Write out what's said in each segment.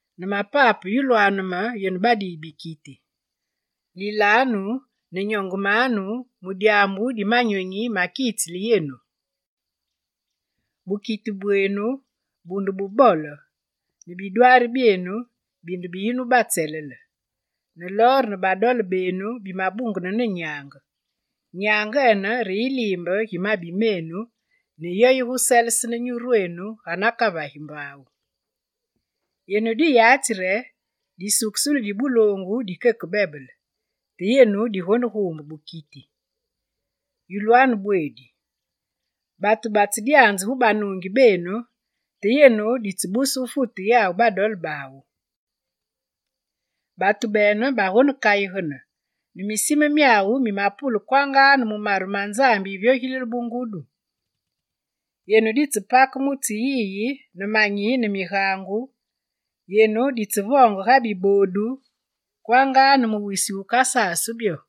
Nemapape, yulwanu me, yenu badi bikiti! Lilanu ne nyongemanu mu dyaambu di manyonyi makitsile yenu! Bukiti bweenu bundebubole ne bidwaari byeenu bindebiyu ne batselele. Ne lor ne badole beenu bimabungene ne nyaange, nyaangene re yiliimbe gi mabi menu ne yo yiguselesene nyurwenu ganakavagi mbaawu. Yenu diyatsi re disukusulu di buloongu dikeke bebele, te yenu digoneguumbe bukiti! Yulwanu bweedi, batu batsedyanze gu banuungi beenu, te yenu ditsebuse wuveege yawu badole bawu! Batu bene bagonekayegene, ne misime myawu mimapule kwanga ne mu maru ma Nzambi yivyogilile bungudu. Yenu ditsepake mu tsi yiyi ne manyi ne migaangu, yenu ditsevoonge ga biboodu kwanga ne mu wisi wukasaasu byo.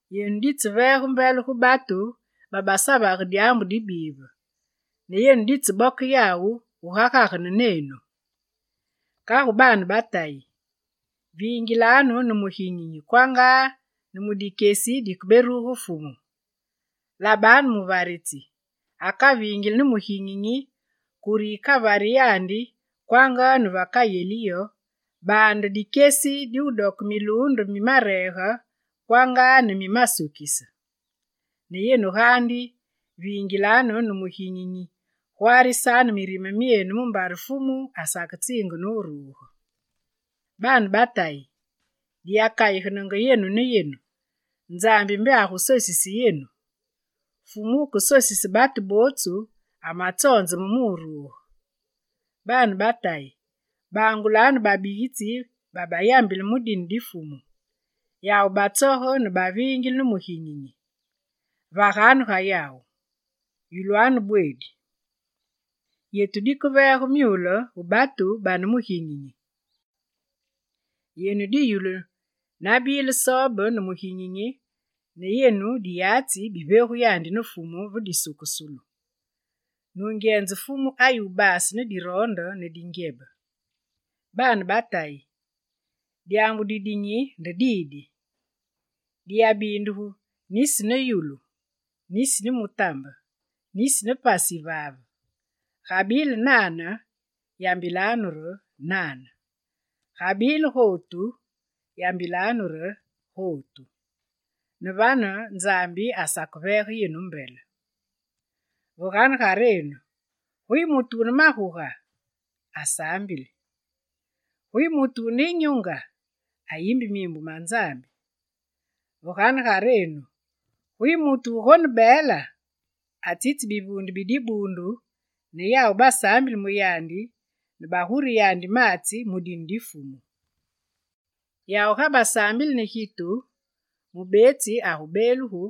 Yenu ditseveege mbele gu batu babasavage dyaambu dibive, ne yenu ditseboke yawu gugagagene nenu. Kagu baane ba Tayi, viingilanu ne muginyinyi, kwanga ne mu dikyesi dikeberuge Fumu. Labanu muvaritsi, akaviingili ne muginyinyi, kure yikavari yandi kwanga ne vakayeli yo, baande dikyesi diwudoke miluunde mi mareege kwanga ne mimasukise. Ne yenu gaandi viingilanu ne muginyinyi, gwaarisanu murime wenu mumbare Fumu asaketsiinge ne wuruge! Baane ba Tayi, diyakayegenenge yenu ne yenu, Nzambi mbe agusosise yenu. Fumu wukesosise batu bootsu amatsoonzeme mu wuruge. Baane ba Tayi, bangulanu babigitsi babayambile mu dine di Fumu; yawu batsoge ne baviingile ne muginyinyi. Vaganu ga yawu. Yulwanu bweedi: yetu dikeveege myule gu batu bane muginyinyi; yenu diyulu nabile Soobe ne muginyinyi ne yenu diyatsi biveegu yandi ne Fumu ve disukusulu; nungyenze Fumu ayi wubaase ne diroonde ne dingyebe. Baane ba Tayi, dyaambu didinyi nde didi: diyabinduge nisi ne yulu, nisi ne mutambe, nisi ne pasi yivaave. Ga bile nane, yambilanu re: «Nane»; ga bile gootu, yambilanu re: «Gootu». Ne vane Nzambi asakeveege yenu mbele. Ve ganegarenu guyi mutu wune maguga? Asaambili. Guyi mutu wune yinyunga? Ayimbi miimbu ma Nzambi. Ve ganegarenu guyi mutu wugonebeela? Atsitsi bivuunde bi dibuundu, ne yawu basaambili mu yandi ne baguri yandi maatsi mu dine di Fumu. Yawu ga basaambile ne gitu, mubeetsi agubeelugu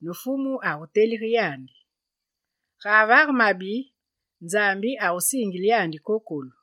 ne Fumu agutelige yandi. Ga avage mabi, Nzambi agusiingile yandi kokolu.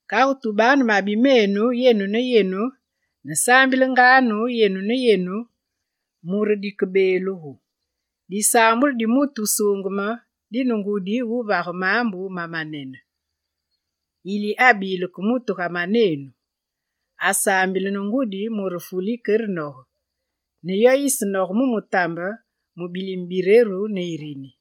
Kagu tubanu mabi menu yenu ne yenu ne saambilenganu yenu ne yenu mure dikebeelugu. Disaambulu di mutu wusuungeme dine ngudi yiwuvage maambu mamanene. Yili abile ke mutu ga manenu. Asaambile ne ngudi mure fule yikerenoge, ne yo yisenoge mu mutambe mu bilime bireru ne yirini.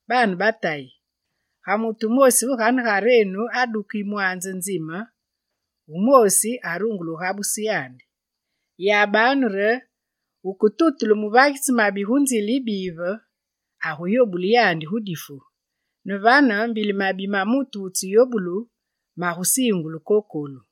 Baane ba Tayi, ga mutu wumoosi ve ganegarenu aduke yimwanze nzime, wumosi arungule wugabuse yandi. Yabanu re, wuketutule muvagitsi mabi gu nzile yibive, aguyobule yandi gu difu, ne vane mbili mabi ma mutu wutseyobulu magusiingulu kokolu.